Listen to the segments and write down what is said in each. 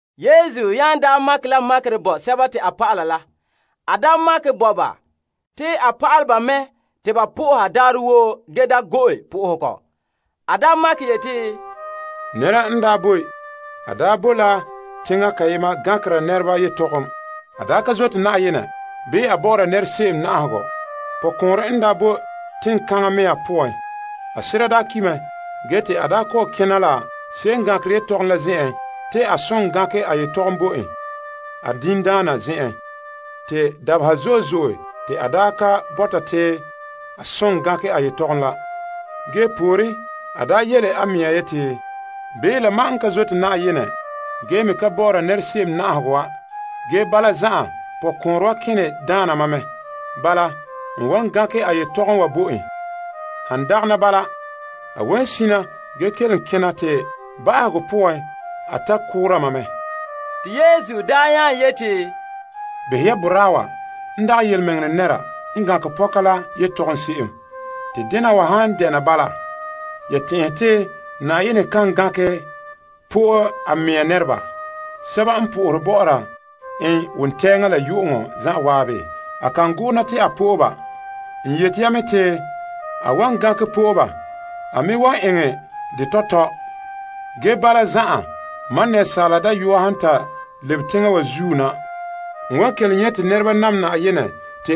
Yesu nya makɛ la makerɛ bo a dɔlɔba la. A makɛ bo ba te ba soha Yenɛ ge da gɔ'ɔra. A makɛ yeti, Nɛra n daa boe. A daa boe la teŋa kayema gankera nɛreba yetɔgom. A daa ka zote Na'ayenɛ bii a bɔ'ɔra nɛra se'em na'ahegɔ. Pɔkɔɔnrɛ n daa boe teŋkaŋa mea me poan. A sera daa ki' mɛ ge te a daa kɔ'ɔn kena la se'em n gankere yetɔgom la zen'en mɛ te a soŋɛ gankɛ a yetɔgom bo en a diŋdaana zen'en. Te dabeha zo'e zo'e te a ka bɔta te a soŋɛ gankɛ yetɔgom la. Ge pooren, a yele a mea yeti, bii la mam n ka zote Na'ayenɛ ge me ka bɔ'ɔra nɛra se'em na'ahegɔ wa, ge bala zan'an pɔkɔɔnrɛ wa kene daana ma mɛ. Bala n wan gankɛ a yetɔgom wa bo en. Han dagana bala, a wan sina ge kelom kena te ba'ahegɔ poan a tare la ɛnregɔ koora mam. Te Yesu nya yeti, Behɛ ya boraa wa n dagɛ tontɔɔdaana wa n gankɛ pɔka la yetɔgom se'em. Te dena wa han dɛna bala, ya tɛn'ɛhe te Na'ayenɛ kan gankɛ po'e a mea nɛreba, sɛba n sohore en wontɛɛŋa la yu'uŋɔ zan'an? A kan go'ona te a po'e ba. N yete ya mɛ te a wan gankɛ po'e ba. A me wan eŋɛ dɛ tɔtɔ. Ge bala zan'an, Asaala Dayɔa han ta lebe teŋa wa zuo na, n wan kelom nyɛ' te nɛreba nam Na'ayenɛ?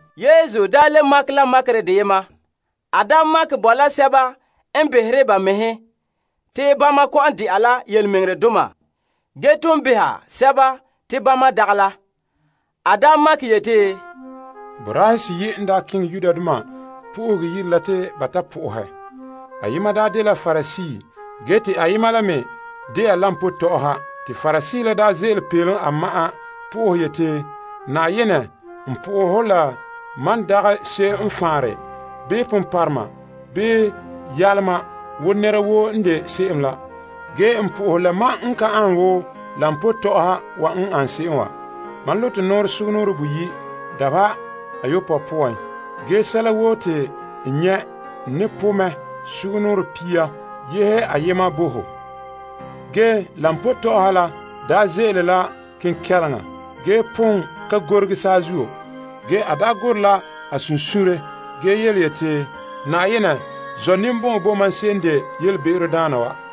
Yesu le makɛ la makerɛ deyema. A makɛ bo la nɛresɛba n behere ba mɛhe te bama kɔ'ɔn de'a la tontɔɔdoma ge ton beha sɛba te bama dagɛ la. A makɛ yeti, Boraahe seyi' n daa keŋɛ Yenɛ Yire la te ba ta sohɛ Yenɛ. Ayema dela Parisee ge te ayema la me de'a koba tɔ'ɔha. Te Parisee la ze'ele peelom a ma'an sohɛ yeti, Na'ayenɛ, n bo hɔ fara la mam n dagɛ se'em n faanre, bii ponpɔrɔma bii yaloma wo nɛra woo n de se'em la, bii koba tɔ'ɔha wa n an se'em wa. Ge, mam ete zagahɛ mɛŋa sugumnɔɔren boyi' dabeha ayopɔe poan. Ge sɛla woo te n nyɛ' n ne po' mɛ sugumnɔɔren pia yehe ayema bo ho. Ge koba tɔ'ɔha la daa ze'ele la kenkɛleŋa ge pon ka gorege saazuo. Ge a daa gorɛ la a sunsuunre ge yeti, Na'ayenɛ, zɔ' ninbɔn'ɔn bo mam se'em n de yelebe'erodaana wa.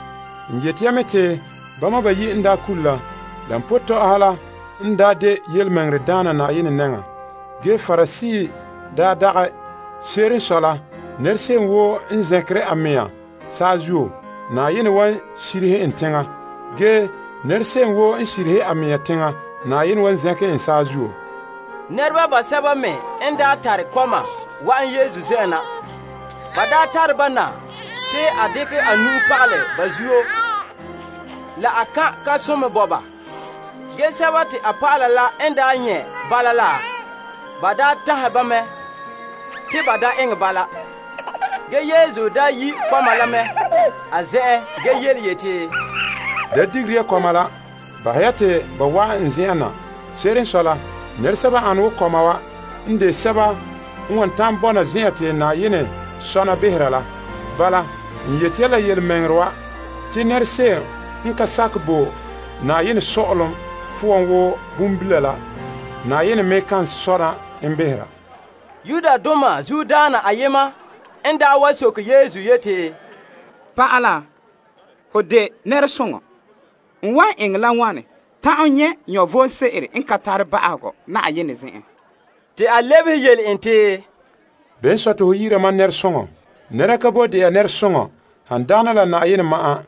N yeti ya mɛ te bama bayi' n kule la, koba tɔ'ɔha la n daa de tontɔɔdaana Na'ayenɛ nɛŋa, ge Parisee dagɛ. Se'ere n sɔe la, nɛra se'em woo n zɛnkere a mea saazuo, Na'ayenɛ wan sirihe en teŋa. Ge nɛra se'em woo n sirihe a mea teŋa, Na'ayenɛ wan zɛnkɛ en saazuo. Nɛreba basɛba me n daa tare kɔma wa'an Yesu zen'en na. Ba tare ba na te a dekɛ nu'uhen pagalɛ ba zuto la kan' kan'somɔ bo ba. Ge a dɔlɔba la n nyɛ' bala la, ba tanhɛ ba mɛ te ba da eŋɛ bala. Ge Yesu yi' kɔma la mɛ a zen'en ge yeti, Da digera ya kɔma la. Bahɛ ya te ba wa'an n zen'en na. Se'ere n sɔe la, nɛresɛba n ane wo kɔma wa n de sɛba n wan ta'an bɔna zen'an te Na'ayenɛ sɔna behera la. Bala, n yete ya la yelemɛŋɛrɛ wa. Te nɛra se'em n ka sakɛ bo Na'ayenɛ Sɔ'ɔlom poan wo bonbila la, Na'ayenɛ me ye kan sɔna en behera. Zuodaana ayema n wa soke Yesu yeti, Pa'ala, hon de nɛresoŋɔ. N wan eŋɛ la wane ta'an nyɛ' vom sebo n ka tare ba'ahegɔ Na'ayenɛ zen'en? Te a lebehe yele en te, Bene n sɔe te ho yi'ira mam nɛresoŋɔ? Nɛra ka boe de'a nɛresoŋɔ han dagana la Na'ayenɛ ma'an.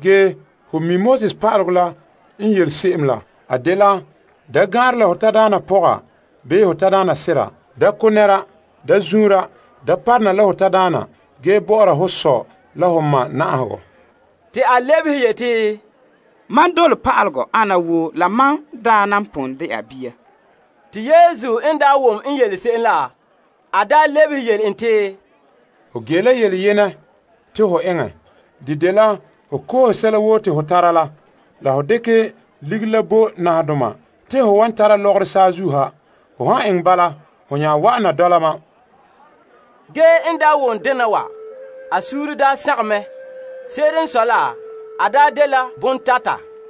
Ge ho mi' Pa'alegɔ la n yele se'em la. A dela: da gan'anrɛ la ho tadaana pɔga bii ho tadaana sera, da ko' nɛra, da zuunra, da parona la ho tadaana ge bɔ'ɔra ho sɔ la ho ma na'ahegɔ. Te a lebehe yeti, Mam dole pa'alegɔ ana woo la mam n daa nan pon de'a bia. Te Yesu n wom n yele se'em la, a lebehe yele en te, Ho ge la yele yenɛ te ho eŋɛ. De dela ho koohe sɛla woo te ho tara la la ho dekɛ ligiri la bo nahadoma te ho wan tara lɔgɔrɔ saazuo ha. Ho han eŋɛ bala, ho nya wa'ana dɔla ma. En wom dena wa, a suunre sagom mɛ. Se'ere n sɔe la, a dela bontata.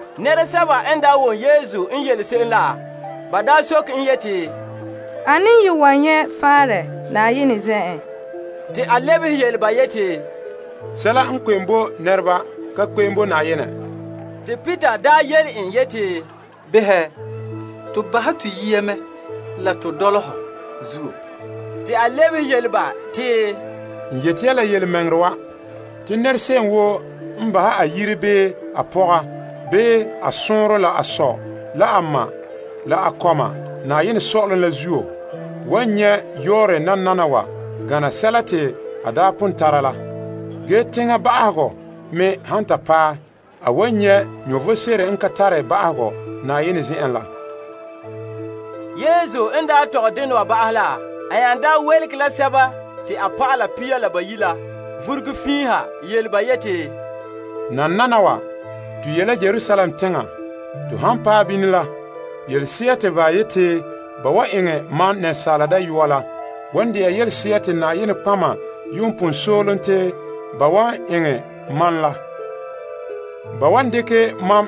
Nɛresɛba n wom Yesu n yele se'em la, ba soke en yeti, Ane n ye wan nyɛ' faanra Na'ayenɛ zen'en? Te a lebehe yele ba yeti, Sɛla n kpe'em bo nɛreba ka kpe'em bo Na'ayenɛ. Te Peter yele en yeti, Behɛ, to bahɛ to yiya mɛ la to dɔla hɔ zuo. Te a lebehe yele ba te, N yete ya la yelemɛŋɛrɛ wa. Te nɛra se'em woo n bahɛ a yire bii a pɔga, bii a sɔɔnrɔ la a sɔ la a ma, la a kɔma Na'ayenɛ Sɔ'ɔlom la zuo, wan nyɛ' yɔɔrɛ nananawa gana sɛla te a daa pon tara la. Ge teŋa ba'ahegɔ me han ta paɛ, a wan nyɛ' vom sebo n ka tare ba'ahegɔ Na'ayenɛ zen'en la. Yesu n daa tɔgɛ dena wa ba'ahɛ la, a nya yelege a dɔlɔba pia la bayi' la vuruge fiin ha yele ba yeti, Nananawa, to ye' la Yerusalem teŋa. To han paɛ bini la, yelese'a te ba yeti ba wan eŋɛ Asaala Dayɔa la wan de'a yelese'a te nɔtɔgɔheba yuun pon soolom te ba wan eŋɛ mam la. Ba wan dekɛ mam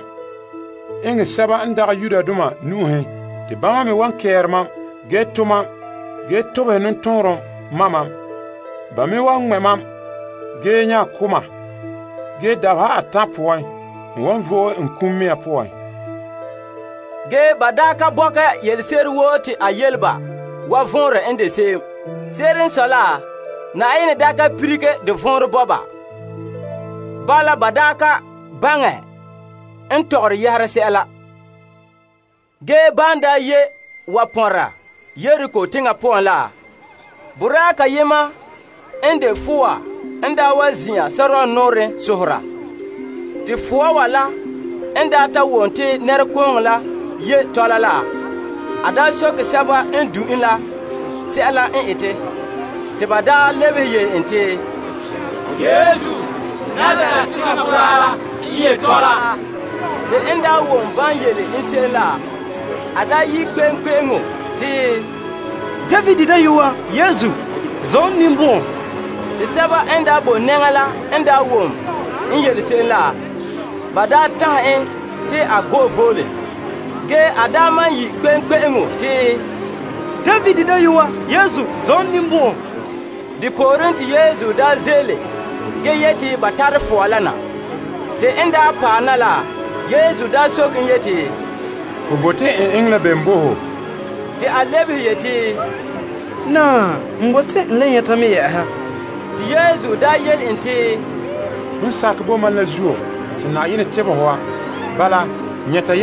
eŋɛ sɛba n dagɛ Yudoma nu'uhen. Te bama me wan kɛɛre mam, ge to' mam ge tobehɛ nɔtɔɔnrom ma' mam. Ba me wan ŋmɛ' mam ge nya ko' mam. Ge dabeha atan' poan, n wan vo'e n kum mea poan. Ge a dɔlɔba ka bɔkɛ yelese'ere woo te a yele ba wa vɔnrɛ n de se'em. Se'ere n sɔe la, Na'ayenɛ ka lilige de vɔnrɛ bo ba. Bala ba ka baŋɛ n tɔgɔre yɛhera sɛla. Ge ban ye' wa pɔnra Yeriko teŋa poan la, boraa kayema n de fɔa n wa zin'an sore nɔɔrɛn sohora. Te fɔa la n ta wom te nɛrekooŋɔ la ye' tɔla la, a soke sɛba n du' en la sɛla n ete. Te ba lebehe yele en te, Yesu, Nazaret teŋa boraa la n ye' tɔla. Te en wom ban yele en se'em la, a yi' kpe'eŋkpe'eŋo te, David dayɔa Yesu, zɔ' n ninbɔn'ɔn! Te sɛba n boe nɛŋa la n wom n yele se'em la, ba tanhɛ en te a go'e voole. Ge a maan yi' kpe'eŋkpe'eŋo te, David dayɔa Yesu, zɔ' n ninbɔn'ɔn! Depooren te Yesu ze'ele ge yete ba tare fɔa la na. Te en paɛ na la, Yesu daa soke en yeti, Ho bote n eŋɛ la bem bo ho? Te a lebehe yeti, Naa, n bote n le nyɛta mɛ. Te Yesu yele en te, Hon sakɛ bo mam la zuo te Na'ayenɛ tebɛ ho wa. Bala nyɛta.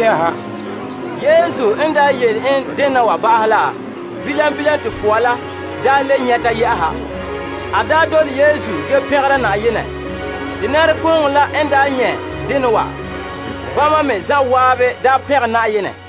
Yesu n yele en dena wa ba'ahɛ la, bilam bilam te fɔa la le nyɛta. A dole Yesu ge pɛngera Na'ayenɛ. Te nɛrekooŋɔ la n nyɛ' dena wa, bama me zan'an pɛngɛ Na'ayenɛ.